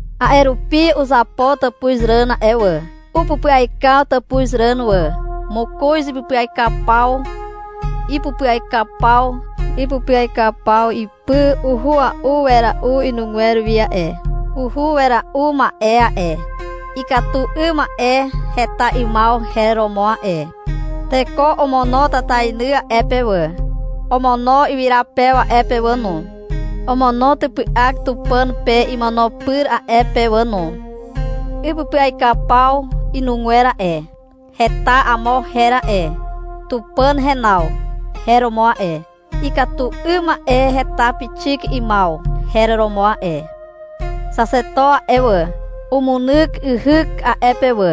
A'e rupi uzapo tàpuzràn a'e wà. Upupyaikaw tàpuzràn wà. Mokoz ipupyaikaw paw. Ipupyaikaw paw ipy uhua'u wera'u inugwer wi a'e. Uhu wera'u ma'e a'e, — Ikatu 'ym ma'e heta 'ymaw her romo a'e. Teko omono tatainy a'e pe wà, omono wyrapew a'e pe wà no, omono typy'ak Tupàn pe imono pyr a'e pe wà no. Ipupyaikaw paw inugwer a'e, heta amo her a'e. — Tupàn henaw, her romo a'e. Ikatu 'ym ma'e heta pixik 'ymaw, her romo a'e. Xaxeto a'e wà, umunyk yhyk a'e pe wà,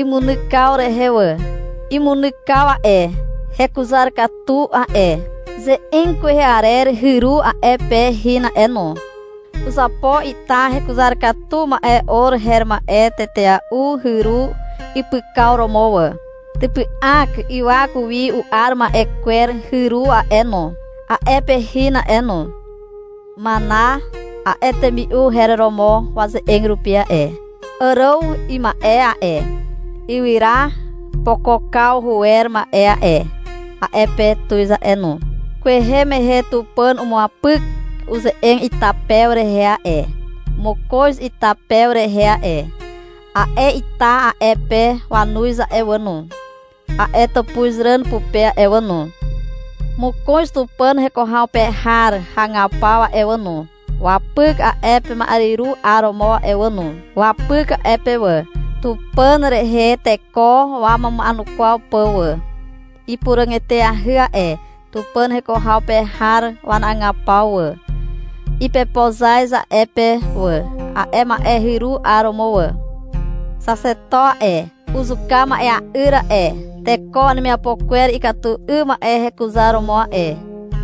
imunykaw rehe wà. Imunykaw a'e, hekuzar katu a'e. Ze'eg kwehe arer hyru a'e pe hin a'e no. Uzapo ita hekuzar katu ma'e or her ma'e tetea'u hyru ipykaw romo wà. Typy'ak ywak wi u'ar ma'e kwer hyru a'e no, a'e pe hin a'e no. — Mana, a'e temi'u her romo waze'eg rupi a'e. Àràw ima'e a'e, ywyra pokokaw huwer ma'e a'e, a'e pe tuz a'e no. Kwehe mehe Tupàn umuapyk uze'eg ita pew rehe a'e, mokoz ita pew rehe a'e. A'e ita a'e pe wanuz a'e wà no, a'e tàpuzràn pupe a'e wà no. Mokoz Tupàn heko haw pe har hagapaw a'e wà no, wapyk a'e ma'eryru 'aromo a'e wà no. Wapyk a'e pe wà, Tupàn rehe teko wamuma'enukwaw pà wà. Ipuràg eteahy a'e Tupàn heko haw pe har wanagapaw wà. Ipepozaz a'e pe wà, a'e ma'e hyru 'aromo wà. Xaxeto a'e, uzuka ma'ea'yr a'e, teko wanemiapo kwer ikatu 'ym ma'e hekuzaromo a'e.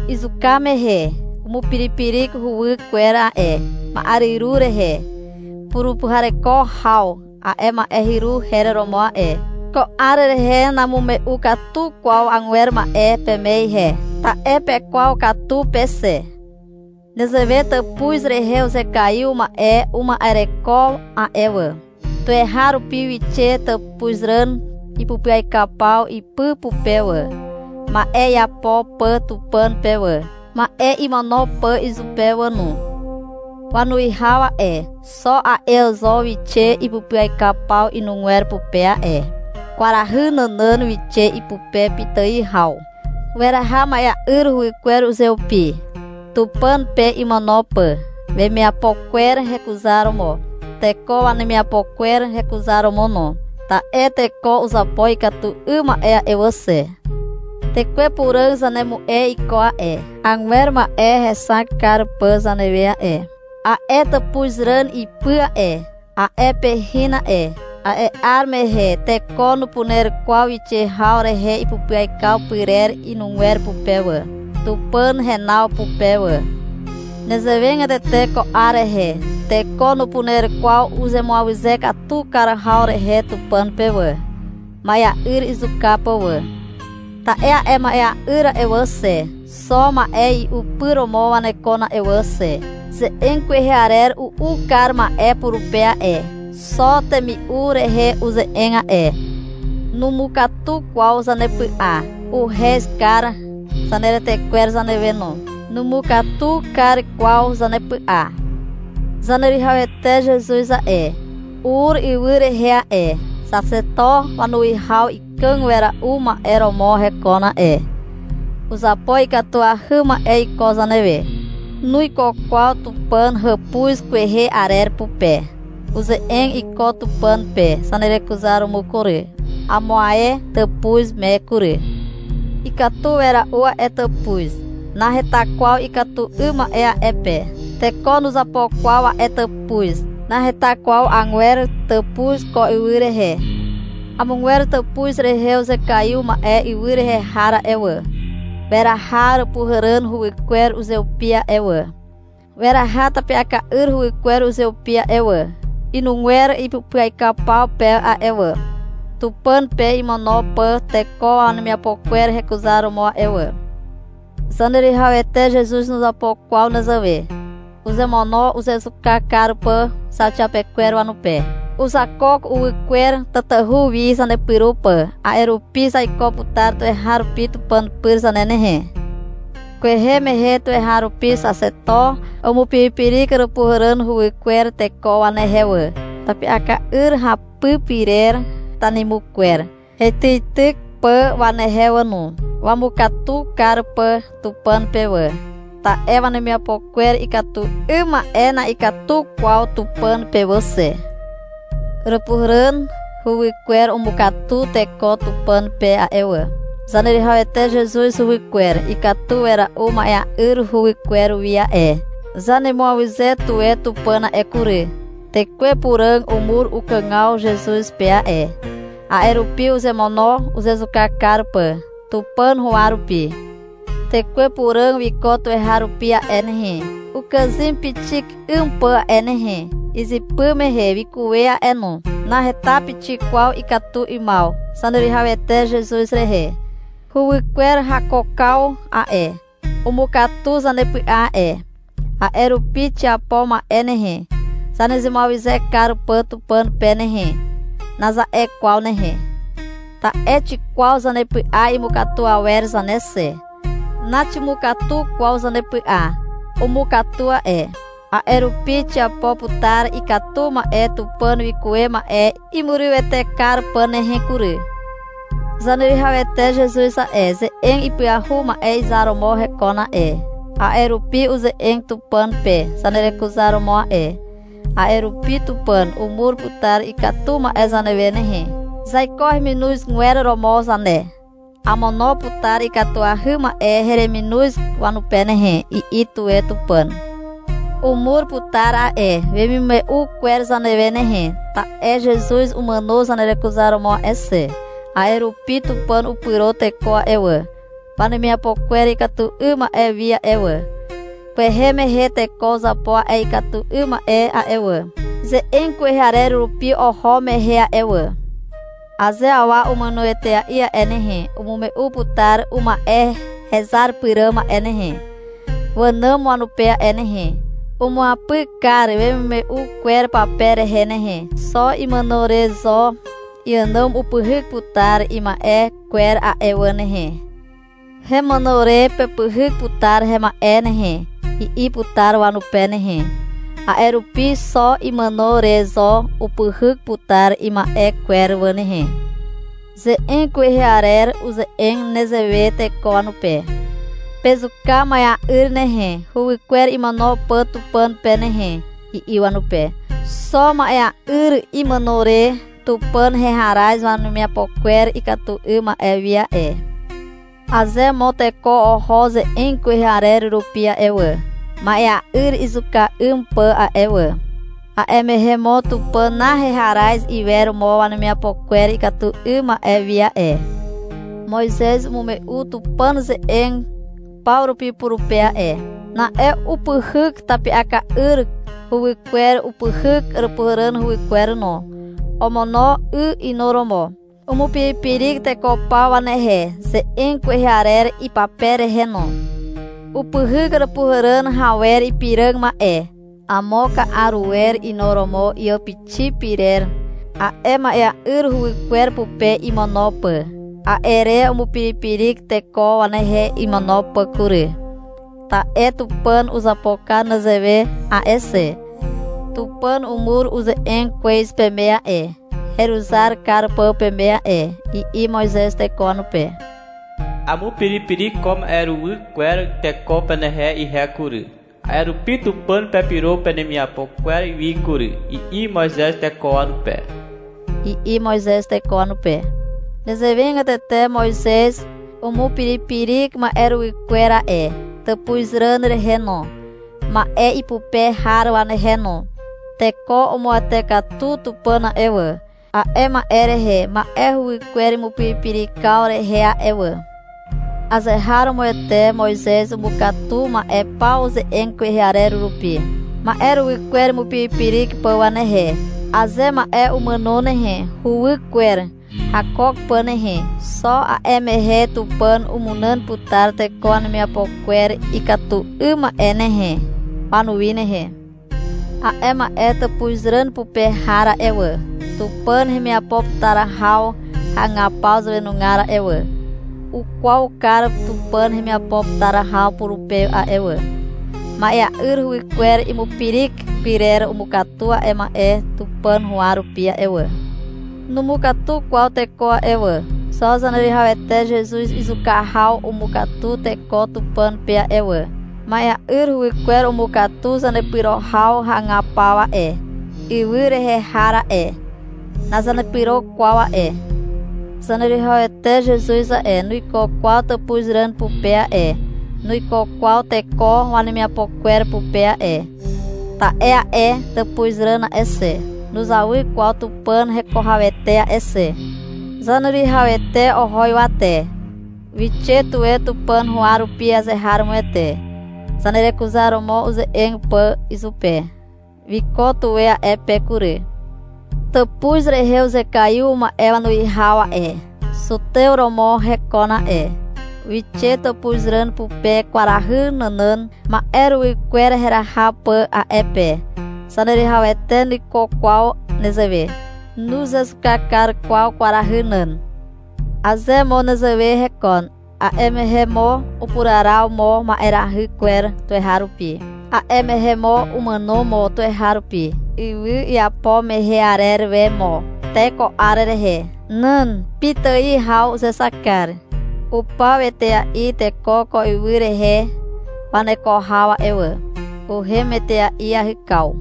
Izuka mehe umupiripirik huwykwer a'e ma'eryru rehe. — Purupuhareko haw, a'e ma'e hyru her romo a'e. Ko 'ar rehe namume'u katu kwaw agwer ma'e peme ihe, ta'e pekwaw katu pe xe. Nezewe tàpuz rehe uzekaiw ma'e uma'ereko a'e wà. Tuweharupi wixe tàpuzràn ipupyaikaw paw ipy pupe wà, ma'e iapo pà Tupàn pe wà, ma'e imono pà izupe wà no. Wanuwihaw a'e, xo a'e zo wixe ipupyaikaw paw inugwer pupe a'e. Kwarahy nànàn wixe ipupe pitài haw. Weraha ma'ea'yr huwykwer uzeupi, Tupàn pe imono pà, wemiapo kwer hekuzaromo, teko wanemiapo kwer hekuzaromo no. Ta'e teko uzapo ikatu 'ym ma'e a'e wà xe. Tekwe Puràg zanemu'e iko a'e, agwer ma'e hexak kar pà zanewe a'e. A'e tàpuzràn ipy a'e, a'e pe hin a'e. A'e 'ar mehe teko nupuner kwaw wixe haw rehe ipupyaikaw pyrer inugwer pupe wà, Tupàn henaw pupe wà. Nezewegatete ko 'ar rehe teko nupuner kwaw uzemuawyze katu kar haw rehe Tupàn pe wà, ma'ea'yr izuka pà wà. Ta'e a'e ma'ea'yr a'e wà xe, xo ma'e i'u pyr romo wanekon a'e wà xe. Ze'eg kwehe arer u'u kar ma'e purupe a'e. Xo temi'u rehe uze'eg a'e. Numukatu kwaw zanepy'a. Uhez kar zaneretekwer zanewe no. Numukatu kar kwaw zanepy'a. Zaneruwihawete Zezuz a'e, ur ywy rehe a'e. Xaxeto wanuwihaw ikàg wera'u ma'e romo hekon a'e. Uzapo ikatuahy ma'e iko zanewe. Nuiko kwaw Tupàn hàpuz kwehe arer pupe. Uze'eg iko Tupàn pe zanerekuzaromo kury, amo ae tàpuz me kury. Ikatu wera'u a'e tàpuz. Naheta kwaw ikatu 'ym ma'e a'e pe. Teko nuzapo kwaw a'e tàpuz. Naheta kwaw agwer tàpuz ko ywy rehe. Amogwer tàpuz rehe uzekaiw ma'e ywy rehe har a'e wà, weraha Àràpuhàràn huwykwer uzeupi a'e wà, weraha tapi'aka'yr huwykwer uzeupi a'e wà, inugwer ipupyaikaw paw pe a'e wà, Tupàn pe imono pà teko wanemiapo kwer hekuzaromo a'e wà. Zaneruwihawete Zezuz nuzapo kwaw nezewe. Uzemono uzezuka kar pà zauxiapekwer wanupe. Uzakook uwy kwer, tatahu wi zanepyro pà, a'e rupi zaiko putar tuweharupi Tupàn pyr zane nehe. Kwehe mehe tuweharupi xaxeto umupiripirik Àràpuhàràn huwykwer teko wanehe wà, tapi'aka'yr hapy pyrer tanimukwer heityityk pà wanehe wà no, wamukatu kar pà Tupàn pe wà, ta'e wanemiapo kwer ikatu 'ym ma'e na'ikatu kwaw Tupàn pe wà xe. Àràpuhàràn huwykwer umukatu teko Tupàn pe a'e wà. Zaneruwihawete Zezuz huwykwer ikatu wera'u ma'ea'yr huwykwer wi a'e. Zanemuawyze tuwe Tupàn a'e kury. Tekwe Puràg umur ukàgaw Zezuz pe a'e. A'e rupi uzemono uzezuka kar pà, Tupàn huwa rupi. Tekwe Puràg wiko tuweharupi a'e nehe, ukàzym pixik 'ym pà a'e nehe. Izypy mehe wikuwe a'e no. Naheta pixik kwaw ikatu 'ymaw Zaneruwihawete Zezuz rehe. Huwykwer hakookaw a'e, umukatu zanepy'a a'e. A'e rupi — Xiapo ma'e nehe, zanemuawyze kar pà Tupàn pe nehe, naza'e kwaw nehe. Ta'e xikwaw zanepy'a imukatu awer zane xe. Naximukatu kwaw zanepy'a. Umukatu a'e. A'e rupi xiapo putar ikatu ma'e Tupàn wikuwe ma'e imurywete kar pà nehe kury. Zaneruwihawete Zezuz a'e, ze'eg ipyahu ma'e izar romo hekon a'e, a'e rupi uze'eg Tupàn pe zanerekuzaromo a'e. A'e rupi Tupàn umur putar ikatu ma'e zanewe nehe. Zaiko heminozgwer romo zane. — Amono putar ikatuahy ma'e hereminoz wanupe nehe, i'i tuwe Tupàn. Umur putar a'e wemimume'u kwer zanewe nehe, ta'e Zezuz umàno zanerekuzaromo a'e xe. A'e rupi Tupàn upyro teko a'e wà, wanemiapo kwer ikatu 'ym ma'e wi a'e wà. Kwehe mehe teko uzapo a'e ikatu 'ym ma'e a'e wà, ze'eg kwehe arer rupi oho mehe a'e wà. Aze awa umàno etea'i a'e nehe, umume'u putar uma'e hezar pyràm a'e nehe, wànàm wanupe a'e nehe. Umuapyk kar wemimume'u kwer pape rehe nehe. Xo imàno re zo iànàm upyhyk putar ima'e kwer a'e wà nehe. — Hemàno re pepyhyk putar hema'e nehe, i'i putar wanupe nehe. A'e rupi xo imàno re zo upyhyk putar ima'e kwer wà nehe. Ze'eg kwehe arer uze'eg nezewe teko wanupe. — Pezuka ma'ea'yr nehe, huwykwer imono pà Tupàn pe nehe, i'i wanupe. Xo ma'ea'yr imàno re Tupàn heharaz wanemiapo kwer ikatu 'ym ma'e wi a'e. Aze mo teko oho ze'eg kwehe arer rupi a'e wà, ma'ea'yr izuka 'ym pà a'e wà, a'e mehe mo Tupàn naheharaz iwer mo wanemiapo kwer ikatu 'ym ma'e wi a'e. Moizez umume'u Tupàn ze'eg paw rupi purupe a'e. Na'e upyhyk tapi'aka'yr huwykwer, upyhyk Àràpuhàràn huwykwer no. Omono 'y inuromo. Umupiripirik teko paw wanehe, ze'eg kwehe arer ipape rehe no. Upyhyk Àràpuhàràn rawer ipiràg ma'e, amo ka'a ruwer inuromo iàpixi pyrer, a'e ma'ea'yr huwykwer pupe imono pà. A'e re umupiripirik teko wanehe imono pà kury, ta'e Tupàn uzapo kar nezewe a'e xe. — Tupàn umur uze'eg kwez peme a'e, heruzar kar pà peme a'e, i'i Moizez teko wanupe. — Amupiripirik ko ma'eruwy kwer teko penehe ihe kury. A'e rupi Tupàn pepyro penemiapo kwer wi kury, i'i Moizez teko wanupe. Nezewegatete Moizez umupiripirik ma'eruwy kwer a'e tàpuzràn rehe no, ma'e ipupe har wanehe no. Teko umuwete katu Tupàn a'e wà, a'e ma'e rehe ma'e huwykwer imupiripirikaw rehe a'e wà. Azeharomoete Moizez umukatu ma'e paw ze'eg kwehe arer rupi, ma'eruwy kwer imupiripirik pà wanehe. Aze ma'e umàno nehe, uwy kwer hakook pà nehe, xo a'e mehe Tupàn umunàn putar teko wanemiapo kwer ikatu 'ym ma'e nehe, wanuwi nehe. A'e ma'e tàpuzràn pupe har a'e wà, Tupàn hemiapo putar haw hagapaw zàwenugar a'e wà, ukwaw kar Tupàn hemiapo putar haw purupe a'e wà. Ma'ea'yr huwykwer imupirik pyrer umukatu a'e ma'e Tupàn huwa rupi a'e wà. Numukatu kwaw teko a'e wà. Xo Zaneruwihawete Zezuz izuka haw umukatu teko Tupàn pe a'e wà. Ma'ea'yr huwykwer umukatu zanepyro haw hagapaw a'e, ywy rehe har a'e. Nazanepyro kwaw a'e. Zaneruwihawete Zezuz a'e, nuiko kwaw tàpuzràn pupe a'e, nuiko kwaw teko wanemiapo kwer pupe a'e. Ta'e a'e tàpuzràn a'e xe, nuzawy kwaw Tupàn heko hawete a'e xe. Zaneruwihawete oho ywate, wixe tuwe Tupàn huwa rupi azeharomoete, zanerekuzaromo uze'eg pà izupe. Wiko tuwe a'e pe kury. Tàpuz rehe uzekaiw ma'e wanuwihaw a'e, zutew romo hekon a'e. Wixe tàpuzràn pupe kwarahy nànàn, ma'e huwykwer heraha pà a'e pe. Zaneruwihawete nuiko kwaw nezewe. Nuzezuka kar kwaw kwarahy nàn. Aze mo nezewe hekon, a'e mehe mo upuraraw mo ma'erahy kwer tuweharupi, a'e mehe mo umàno mo tuweharupi, ywy iapo mehe arer we mo te ko 'ar rehe. Nan. Pitài haw uzexak kar. Upaw etea'i teko ko ywy rehe waneko haw a'e wà. Uhem etea'i iahykaw.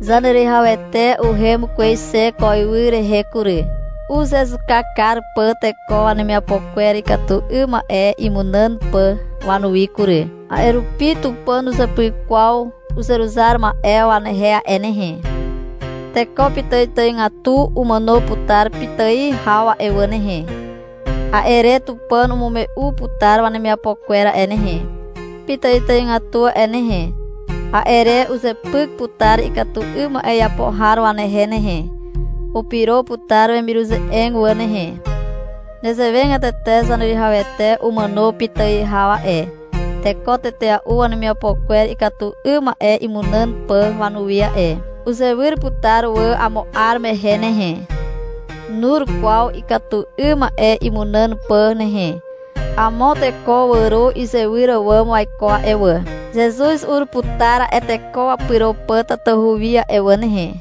Zaneruwihawete uhem kwez xe ko ywy rehe kury, uzezuka kar pà teko wanemiapo kwer ikatu 'ym ma'e imunàn pà wanuwi kury. A'e rupi Tupàn nuzepyk kwaw uzeruzar ma'e wanehe a'e nehe. Teko pitàitàigatu umàno putar pitài haw a'e wà nehe. A'e re Tupàn umume'u putar wanemiapo kwer a'e nehe, pitàitàigatu a'e nehe. A'e re uzepyk putar ikatu 'ym ma'e iapo har wanehe nehe. Upyro putar wemiruze'eg wà nehe. Nezewegatete Zaneruwihawete umàno pitài haw a'e, teko tetea'u wanemiapo kwer ikatu 'ym ma'e imunàn pà wanuwi a'e. Uzewyr putar wà amo 'ar mehe nehe. Nur kwaw ikatu 'ym ma'e imunàn pà nehe. Amo teko wàro izewyr àwàm waiko a'e wà. Zezuz ur putar a'e teko wapyro pà tatahu wi a'e wà nehe.